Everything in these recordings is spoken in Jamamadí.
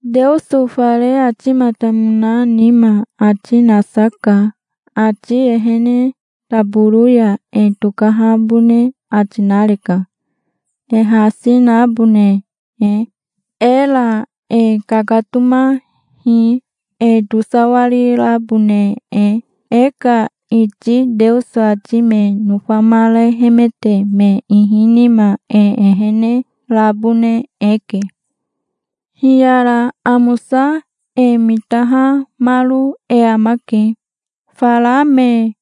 Teoso fare atimatamona nima ati nasa ka. Ati ehene taboro ya e tokahabone ati nareka, e hasi nabone e. Era e kakatomahi, e tosawarirabone e. E ka iti Teoso ati me nofamarehemete me ihi nima e ehene rabone eke. Hiyara amosa e mitahamaro e amake, fara me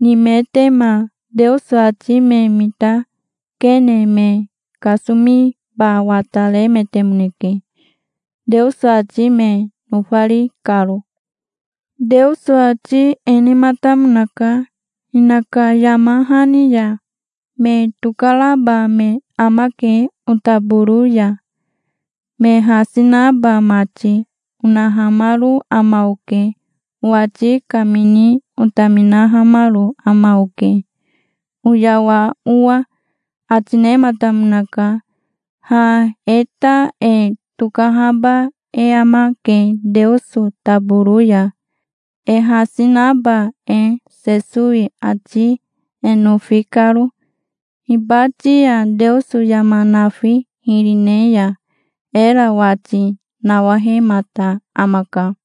nimetema. Teoso ati me mitakene me kasomiba wataremetemoneke, Teoso ati me nofari karo. Teoso ati e nematamonaka, hinaka yama hani ya: "'Me tokaraba me amake otaboro ya, me hasi naba mati', onahamaro ama oke. Owati kamini otaminahamaro ama oke, oyawa owa", ati nematamonaka. Ha e ta e tokahaba e amake Teoso taboro ya, e hasi naba e, Sesowi ati e nofi karo. Hibati ya Teoso yama nafi hiri ne ya era wati nawahemata amaka.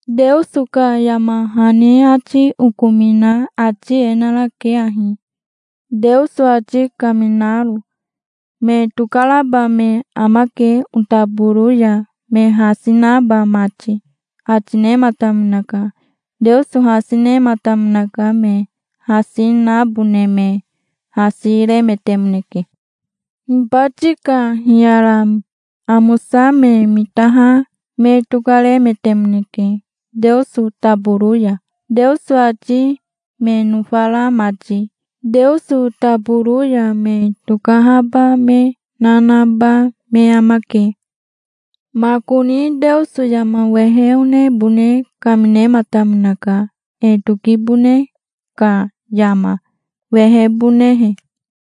Teoso ka yama hani ati okomina ati e narake ahi, Teoso ati kaminaro: "Me tokaraba me amake otaboro ya, me hasi naba mati", ati nematamonaka. Teoso hasi nematamonaka. Me hasi nabone me hasi remetemoneke. Hibati ka hiyara amosa me mitaha me tokaremetemoneke Teoso taboro ya, Teoso ati me nofara mati. Teoso taboro ya me tokahaba me na naba me amake. Makoni Teoso yama wehe onebone kaminematamonaka, e tokibone ka yama wehebonehe,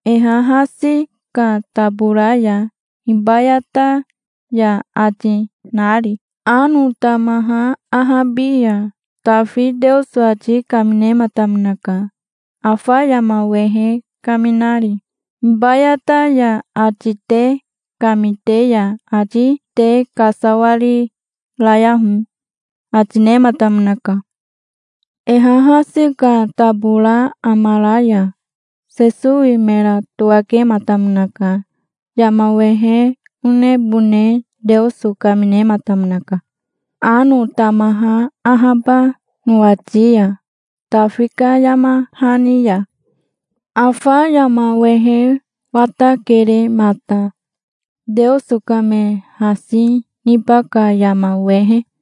e hahasi ka tabora ya, "Hibayata ya", ati nari. Ano tamaha ahabi ya Tafi Teoso ati kaminematamonaka, afa yama wehe kaminari. "Hibayata ya ati te kamite ya, ati te kasawarirayaho", ati nematamonaka. E hahasi ka tabora amara ya Sesowe mera towakematamonaka. Yama wehe onebone Teoso kaminematamonaka, ano tamaha ahaba nowati ya, Tafi ka yama hani ya. Afa yama wehe watakere mata, Teoso ka me hasi niba ka yama wehe.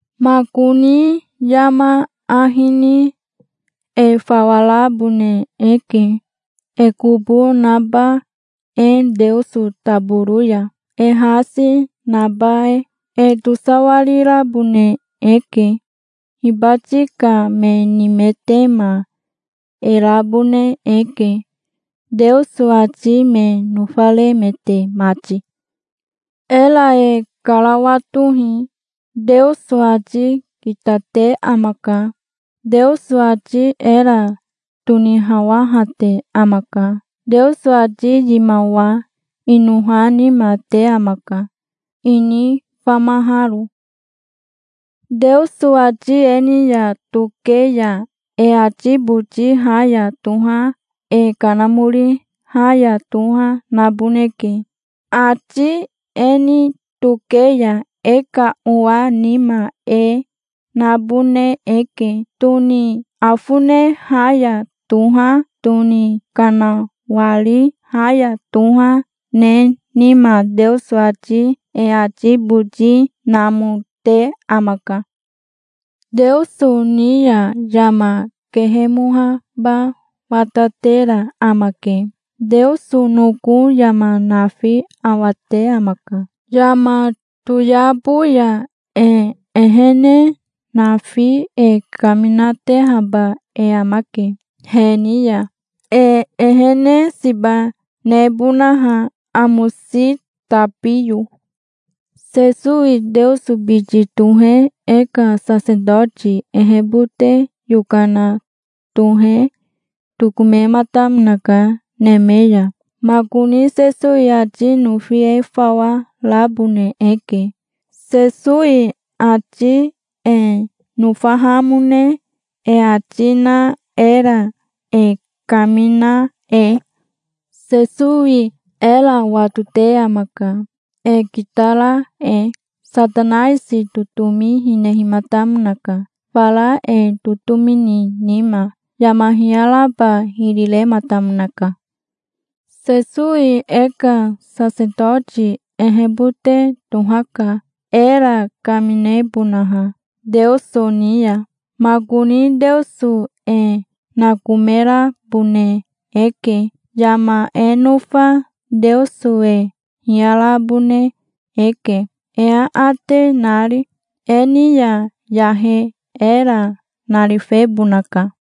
Makoni yama ahi ni e fawa rabone eke, e kobo naba e Teoso taboro ya, e hasi naba e. E tosawarirabone eke. Hibati ka me nimetema e rabone eke, Teoso ati me nofaremete mati. Era e karawatohi. Teoso ati kitate amaka. Teoso ati era tonihawahate amaka. Teoso ati yimawa inoha nima te amaka, ini famaharo. Teoso ati e ni ya toke ya e ati boti ha ya toha, e kanamori ha ya toha naboneke. Ati e ni toke ya e ka owa nima e nabone eke, tone afone ha ya toha, tone kanawari ha ya toha ne nima. Teoso ati e ati boti namote amaka. Teoso ni ya yama kehemoaba watatera amake. Teoso noko yama nafi awate amaka. Yama toyabo ya e ehene nafi e kaminatehaba e amake he ni ya, e ehene siba nebonaha amosi tabiyo. Sesowi Teoso biti tohe e ka sasetoti ehebote yokana tohe tokomematamonaka neme ya. Makoni Sesowi ati nofi e fawa rabone eke, Sesowi ati e nofahamone e ati na era e kamina e. Sesowi era watote amaka, e kitara e. Satanaisi totomi hinehimatamonaka, fara e totomi ni nima. Yama hiyaraba hiri rematamonaka. Sesowi e ka sasetoti ehebote tohaka, era kaminebonaha Teoso ni ya. Makoni Teoso e nakomerabone eke. Yama e nofa Teoso e hiyarabone eke, e aate nari. E ni ya yahe era narifebonaka.